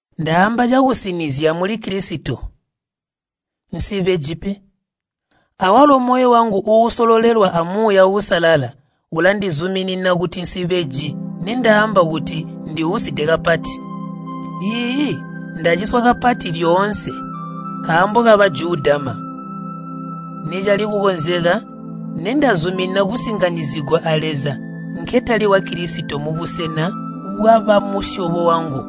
Ndaamba cakusinizya muli Kilisito, nsibeji pe. Awalo moyo wangu uusololelwa a Muuya Uusalala ulandizuminina kuti nsibeji nindaamba kuti ndiuside kapati. Iiyi, ndaciswa kapati lyoonse nkaambo ka Bajudama. Nicali kukonzeka nindazumina kusinganyizigwa a Leza nketali wa Kilisito mubusena bwabamusyobo wangu.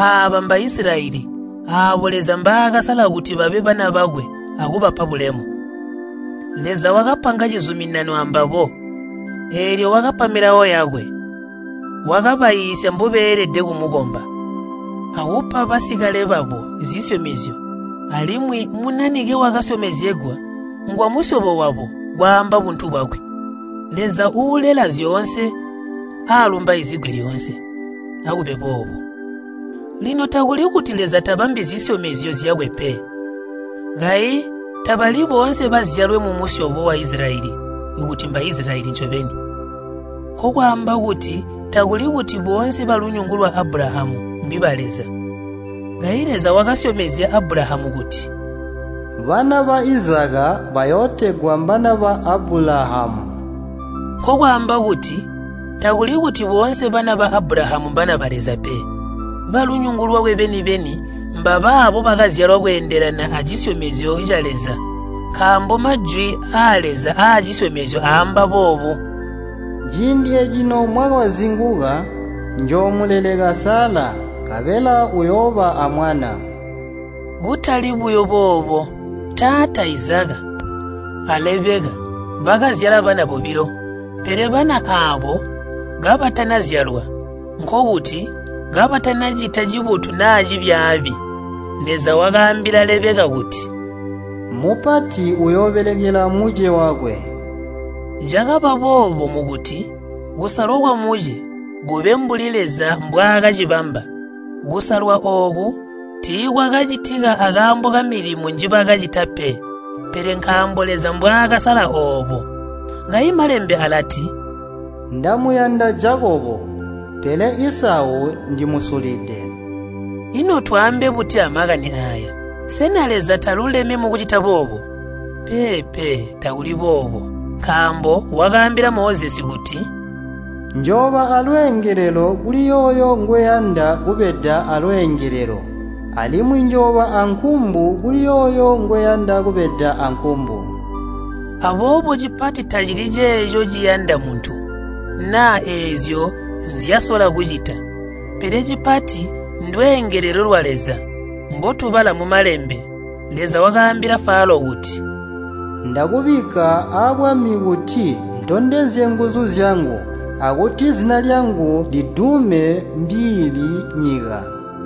Aaba mba Isilayeli aabo Leza mbaakasala kuti babe bana bakwe akupaba bulemu. Leza wakapanga cizuminano ambabo, eelyo wakapa Milawo yakwe. Wakabaiisya mbobeelede kumukomba, akupa basikale babo zisyomezyo alimwi Munanike wakasyomezegwa ngwamusyobo wabo kwaamba buntu bwakwe. Leza uulela zyoonse aalumbaizigwe lyoonse. Akube boobo! Lino takuli kuti Leza tabambi zisyomezyo zyakwe pe. Kayi tabali boonse bazyalwe mumusyobo wa Isilayeli kuti mba Isilayeli ncobeni. Nkokwaamba kuti takuli kuti boonse balunyungu lwa Abulahamu mbiba Leza. Kayi Leza wakasyomezya Abulahamu kuti, “Bana ba Izaka bayootegwa mbana ba Abulahamu.” Nkokwaamba kuti takuli kuti boonse bana ba Abulahamu mbana ba Leza pe. Balunyungu lwakwe beni-beni mbabaabo bakazyalwa kweendelana acisyomezyo ca Leza. Nkaambo majwi aa Leza acisyomezyo aamba boobu, “Ciindi eecino mwaka wazinguka, njoomuleleka Sala, nkabela uyooba amwana.” Kutali buyo boobo. Taata Izaka a Lebeka bakazyala bana bobilo. Pele bana aabo kabatanazyalwa, nkokuti kabatanacita cibotu naa cibyaabi, Leza wakaambila Lebeka kuti, “Mupati uyoobelekela muce wakwe.” Cakaba boobo mukuti kusalwa kwamuce kube mbuli Leza mbwaakacibamba. Kusalwa ooku tiikwakacitika akaambo kamilimo njibakacita pe, pele nkaambo Leza mbwaakasala oobo. Kayi Malembe alati, “Ndamuyanda Jakobo, pele Isau ndimusulide.” Ino twaambe buti amakani aaya? Sena Leza taluleme mukucita boobo? Peepe, takuli boobo. Nkaambo wakaambila Mozesi kuti, “Njooba aalweengelelo kuli yooyo ngweyanda kubeda aalweengelelo, alimwi njooba aankumbu kuli yooyo ngweyanda kubeda aankumbu.” Aboobo cipati tacili ceeco ciyanda muntu, naa eezyo nzyasola kucita, pele cipati ndweengelelo lwa Leza. Mbootubala mu Malembe, Leza wakaambila Falo kuti, “Ndakubikka abwami kuti ntondezye nguzu zyangu, akuti zina lyangu lidume mbiili nyika.”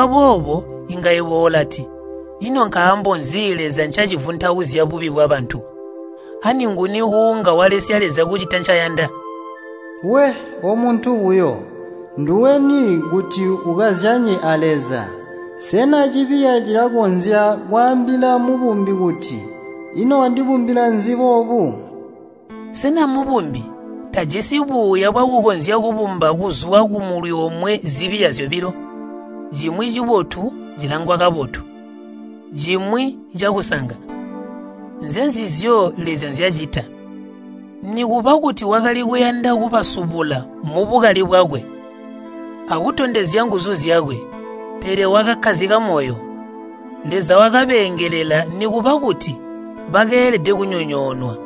Wamvwa boobo inga yebo ulati, “Ino nkaambo nzi Leza ncacivuntauzya bubi bwabantu? Ani nguni uunga walesya Leza kucita ncaayanda?” We! omuntu buyo, nduweni kuti ukazyanye a Leza? Sena cibiya cilakonzya kwaambila mubumbi kuti, “Ino wandibumbila nzi boobu?” Sena mubumbi tajisi buuya bwakukonzya kubumba kuzwa kumulwi omwe zibiya zyobilo, cimwi cibotu cilangwa kabotu, cimwi cakusanga? Nzezizyo Leza nzyacita. Nikuba kuti wakali kuyanda kubasubula mubukali bwakwe akutondezya nguzu zyakwe, pele wakakkazika moyo. Leza wakabeengelela nikuba kuti bakeelede kunyonyoonwa.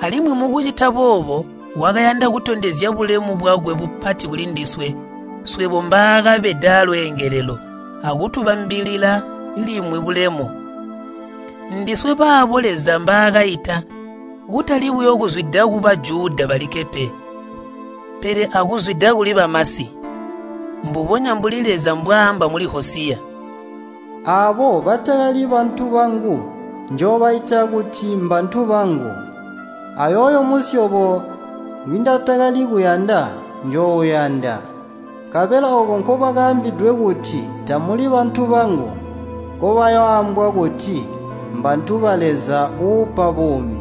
Alimwi mukucita boobo wakayanda kutondezya bulemu bwakwe bupati kulindiswe, swebo mbaakabeda aalweengelelo akutubambilila limwi bulemu. Ndiswe baabo Leza mbaakaita, kutali buyo kuzwida ku Bajuda balikke pe, pele akuzwida kuli bamasi. Mbubonya mbuli Leza mbwaamba muli Hosiya, “Aabo batakali ‘bantu bangu’ njoobaita kuti mbantu bangu. Ayooyo musyobo ngwindatakali kuyanda, njoouyanda. Nkabela ooko nkobakaambidwe kuti, ‘Tamuli bantu bangu,’ nkobayooambwa kuti, ‘Mbantu ba Leza uupa buumi.’”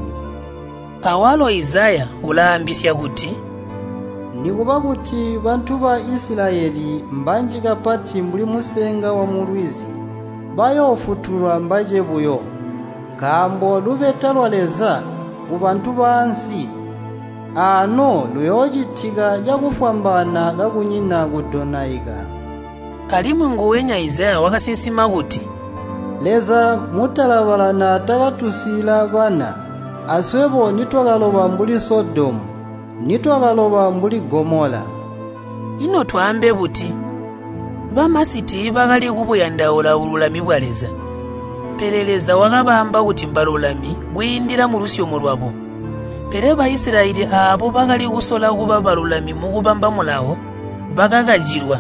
Awalo Izaya ulaambisya kuti, “Nikuba kuti bantu ba Isilayeli mbanji kapati mbuli musenga wamulwizi. Bayoofutulwa mbace buyo. Nkaambo lubeta lwa Leza kubantu baansi aano luyoocitika cakufwambaana kakunyina kudonaika.” Alimwi nguwenya Izaya wakasinsima kuti, “Leza Mutalabala naatakatusiila bana, aswebo nitwakaloba mbuli Sodomu, nitwakaloba mbuli Gomola.” Ino twaambe buti? Bamasi tiibakali kubuyandaula bululami bwa Leza, pele Leza wakabaamba kuti mbalulami kwiindila mulusyomo lwabo. Pele Baisilayeli aabo bakali kusola kuba balulami mukubamba Mulawo, bakakacilwa.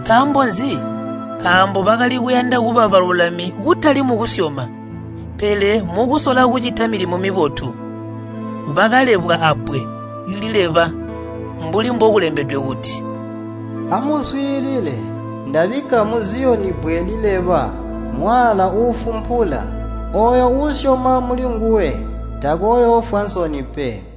Nkaambo nzi? Nkaambo bakali kuyanda kuba balulami kutali mukusyoma, pele mukusola kucita milimo mibotu. Bakalebwa abbwe lileba, mbuli mbokulembedwe kuti, “Amuswiilile, ndabikka mu Ziyoni bbwe lileba, mwaala uufumpula. Ooyo uusyoma mulinguwe, takooyoofwa nsoni pe.”